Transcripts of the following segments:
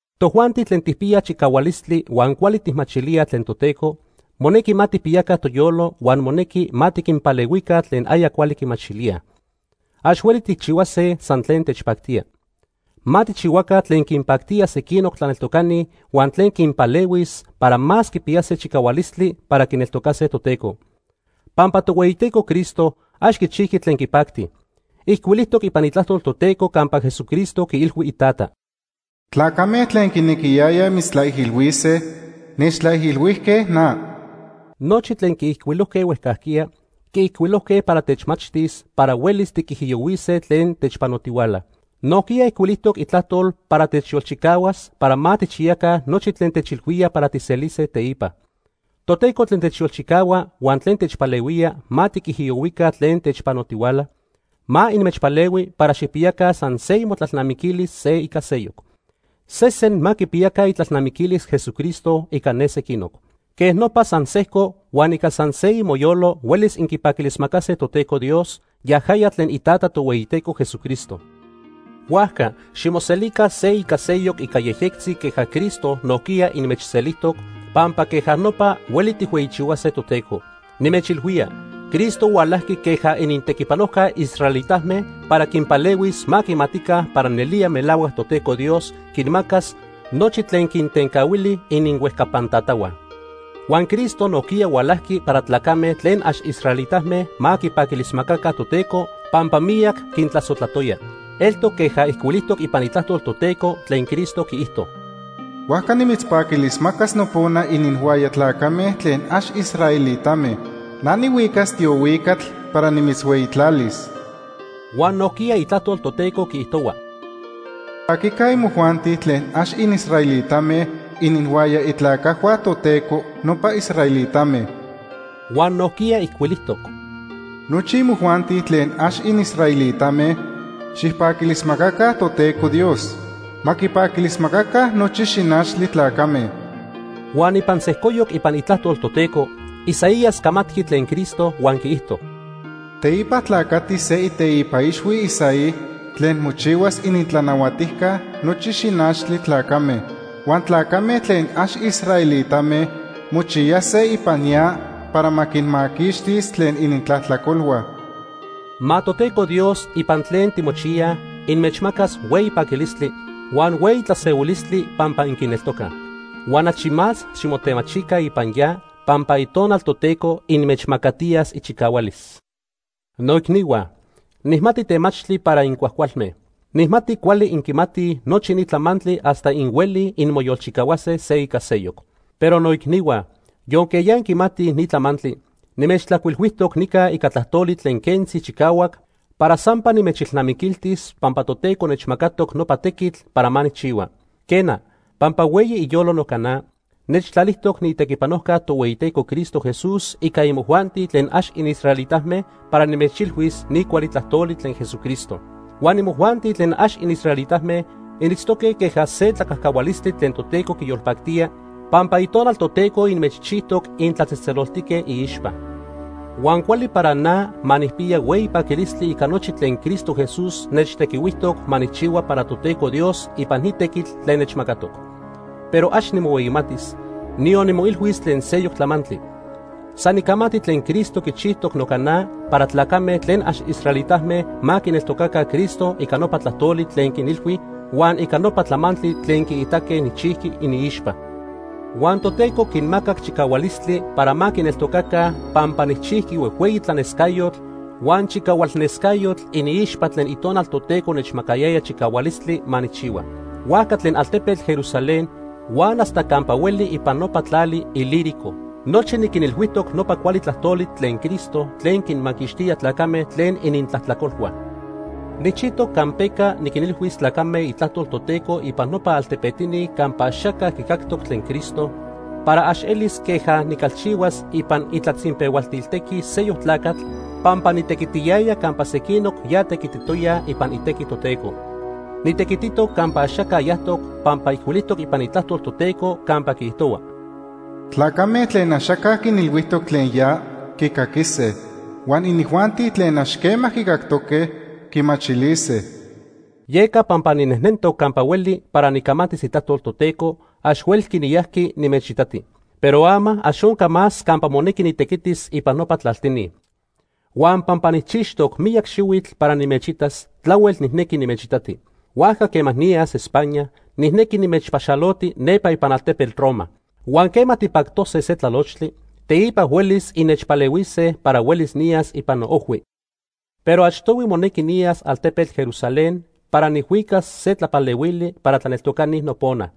Tojuanti tlen tijpiyaj chicahualistli huan cuali tijmachilíaj tlen Toteco, monequi ma tijpiyaca toyolo huan monequi ma tiquinpalehuica tlen aya cuali quimachilíaj. Ax hueli tijchihuase san tlen techpactía. Ma tijchihuaca tlen quinpactía sequinoc tlaneltocani huan tlen quinpalehuis para más quipiyase chicahualistli para quineltocase Toteco. Pampa Tohueyiteco Cristo ax quichijqui tlen quipacti. Ijcuilijtoc ipan Itlajtol Toteco campa Jesucristo quiilhui Itata: “Tlacame tlen quinequiyayaj mitztlaijilhuise, nechtlaijilhuijque na.” Nochi tlen quiijcuilojque huejcajquiya, quiijcuilojque para techmachtis para huelis tiquijiyohuise tlen techpanotihuala. Nojquiya ijcuilijtoc Itlajtol para techyolchicahuas para ma tijchiyaca nochi tlen techilhuía para tijselise teipa. Toteco tlen techyolchicahua huan tlen techpalehuía ma tiquijiyohuica tlen techpanotihuala, ma inmechpalehui para xijpiyaca san se imotlalnamiquilis se ica seyoc. Sesen ma quipiyaca itlalnamiquilis Jesucristo ica ne sequinoc. Quej nopa san sejco huan ica san se imoyolo huelis inquipaquilismacase Toteco Dios, yajaya tlen iTata Tohueyiteco Jesucristo. Huajca ximoselica se ica seyoc ica yejyectzi queja Cristo nojquiya inmechselijtoc, pampa queja nopa hueli tijhueyichihuase Toteco. Nimechilhuía Cristo hualajqui queja inintequipanojca israelitame para quinpalehuis ma quimatica para nelía melahuac Toteco Dios quinmacas nochi tlen quintencahuili ininhuejcapan tatahua. Huan Cristo nojquiya hualajqui para tlacame tlen ax israelitame ma quipaquilismacaca Toteco pampa miyac quintlasojtlatoya. Eltoc queja ijcuilijtoc ipan Itlajtol Toteco tlen Cristo quiijto: “Huajca nimitzpaquilismacas nopona ininhuaya tlacame tlen ax israelitame. Na nihuicas tiohuicatl para nimitzhueyitlalis.” Huan nojquiya Itlajtol Toteco quiijtohua: “Xipaquica imojuanti tlen ax inisraelitame ininhuaya itlacajhua Toteco, nopa israelitame.” Huan nojquiya ijcuilijtoc: “Nochi imojuanti tlen ax inisraelitame xijpaquilismacaca Toteco Dios. Ma quipaquilismacaca nochi xinachtli tlacame.” Huan ipan sejcoyoc ipan Itlajtol Toteco, Isaías camatqui tlen Cristo huan quiijto: “Teipa tlacatis se iteipa ixhui Isaí tlen mochihuas inintlanahuatijca nochi xinachtli tlacame. Huan tlacame tlen ax israelitame mochiyase ipan ya para ma quinmaquixtis tlen inintlajtlacolhua.” Ma Toteco Dios ipan tlen timochiyaj, inmechmacas hueyi paquilistli, huan hueyi tlasehuilistli pampa inquineltocaj. Huan achi más ximotemachica ipan ya pampa Itonal Toteco inmechmacatiyas ichicahualis. Noicnihua, nijmati temachtli para incuajcualme. Nijmati cuali inquimatij nochi ni tlamantli hasta inhuelij inmoyolchicahuase se ica seyoc. Pero, noicnihua, yonque ya inquimatij ni tlamantli, nimechtlajcuilhuijtoc nica ica tlajtoli tlen quentzi chicahuac para sampa nimechilnamiquiltis pampa Toteco nechmacatoc nopa tequitl para ma nijchihua. Quena, pampa hueyi iyolo noca na, nechtlalijtoc niitequipanojca Tohueyiteco Cristo Jesús ica imojuanti tlen ax inisraelitame para nimechilhuis ni cuali tlajtoli tlen Jesucristo. Huan imojuanti tlen ax inisraelitame initztoque queja se tlacajcahualistli tlen Toteco quiyolpactía, pampa Itonal Toteco inmechchijtoc intlatzejtzeloltique iixpa. Huan cuali para na ma nijpiya hueyi paquilistli ica nochi tlen Cristo Jesús nechtequihuijtoc ma nijchihua para Toteco Dios ipan ni tequitl tlen nechmacatoc. Pero ax nimohueyimatis, niyon nimoilhuis tlen seyoc tlamantli. San nicamati tlen Cristo quichijtoc noca na para tlacame tlen ax israelitame ma quineltocaca Cristo ica nopa tlajtoli tlen niquinilhui huan ica nopa tlamantli tlen quiitaque nijchijqui iniixpa. Huan Toteco quinmacac chicahualistli para ma quineltocaca pampa nijchijqui huejhueyi tlanescayotl huan chicahualnescayotl iniixpa tlen Itonal Toteco nechmacayaya chicahualistli ma nijchihua. Huajca tlen altepetl Jerusalén huan hasta campa hueli ipan nopa tlali Ilírico nochi niquinilhuijtoc nopa cuali tlajtoli tlen Cristo tlen quinmaquixtía tlacame tlen inintlajtlacolhua. Nijchijtoc campeca niquinilhuis tlacame itlajtol Toteco ipan nopa altepetini campa axaca quicactoc tlen Cristo, para ax elis queja nicalchihuas ipan itlatzinpehualtil tequi seyoc tlacatl pampa nitequitiyaya campa sequinoc ya tequititoyaj ipan itequi Toteco. Nitequititoc campa axaca yajtoc pampa ijcuilijtoc ipan Itlajtol Toteco campa quiijtohua: “Tlacame tlen axaca quinilhuijtoc tlen ya, quicaquise. Huan inijuanti tlen ax quema quicactoque, quimachilise.” Yeca pampa ninejnentoc campa hueli para nicamatis itlajtol Toteco, ax huelqui niyajqui nimechitati. Pero ama, ax onca más campa monequi nitequitis ipan nopa tlaltini. Huan pampa nijchixtoc miyac xihuitl para nimechitas, tlahuel nijnequi nimechitati, huajca quema niyas España, nijnequi nimechpaxaloti nepa ipan altepetl Roma. Huan quema tipactose se tlalochtli, teipa huelis innechpalehuise para huelis niyas ipan noojhui. Pero achtohui monequi niyas altepetl Jerusalén para nijhuicas se tlapalehuili para tlaneltocani nopona.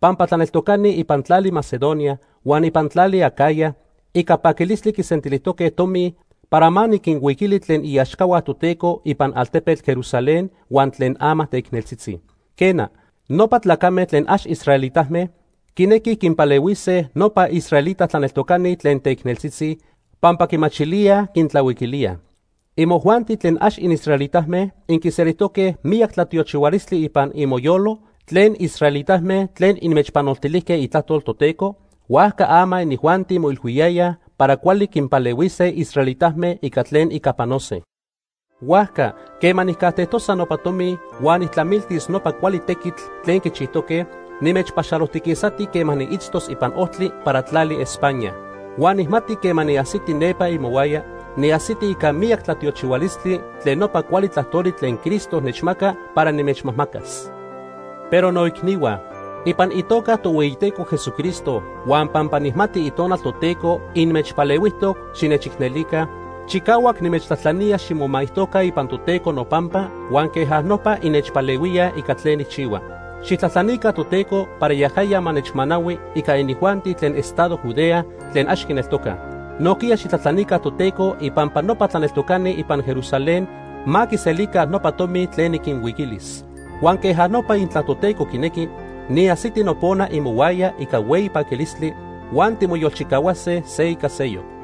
Pampa tlaneltocani ipan tlali Macedonia huan ipan tlali Acaya ica paquilistli quisentilijtoque tomi para ma niquinhuiquili tlen iaxcahua Toteco ipan altepetl Jerusalén huan tlen ama teicneltzitzi. Quena, nopa tlacame tlen ax israelitame quinequij quinpalehuise nopa israelita tlaneltocani tlen teicneltzitzi, pampa quimachilíaj quintlahuiquilíaj. Imojuanti tlen ax inisraelitame inquiselijtoque miyac tlatiochihualistli ipan imoyolo tlen israelitame tlen inmechpanoltilijque itlajtol Toteco, huajca ama inijuanti moilhuiyayaj para cuali quinpalehuise israelitame ica tlen ica panose. Huajca quema nijcajtejtosa nopa tomi huan nijtlamiltis nopa cuali tequitl tlen quichijtoque, nimechpaxalojtiquisati quema niitztoc ipan ojtli para tlali España. Huan nijmati quema niajsiti nepa imohuaya, niajsiti ica miyac tlatiochihualistli tlen nopa cuali tlajtoli tlen Cristo nechmaca para nimechmajmacas. Pero noicnihua, ipan itoca Tohueyiteco Jesucristo huan pampa nijmati Itonal Toteco inmechpalehuijtoc xinechicnelica, chicahuac nimechtlajtlanía ximomaijtoca ipan Toteco nopampa huan queja nopa innechpalehuíaj ica tlen nijchihua. Xijtlajtlanica Toteco para yajaya ma nechmanahui ica inijuanti tlen estado Judea tlen ax quineltocaj. Nojquiya xijtlajtlanica Toteco ipampa nopa tlaneltocani ipan Jerusalén ma quiselica nopa tomi tlen niquinhuiquilis. Huan queja nopa intla Toteco quinequi, niajsiti nopona imohuaya ica hueyi paquilistli, huan timoyolchicahuase se ica seyoc.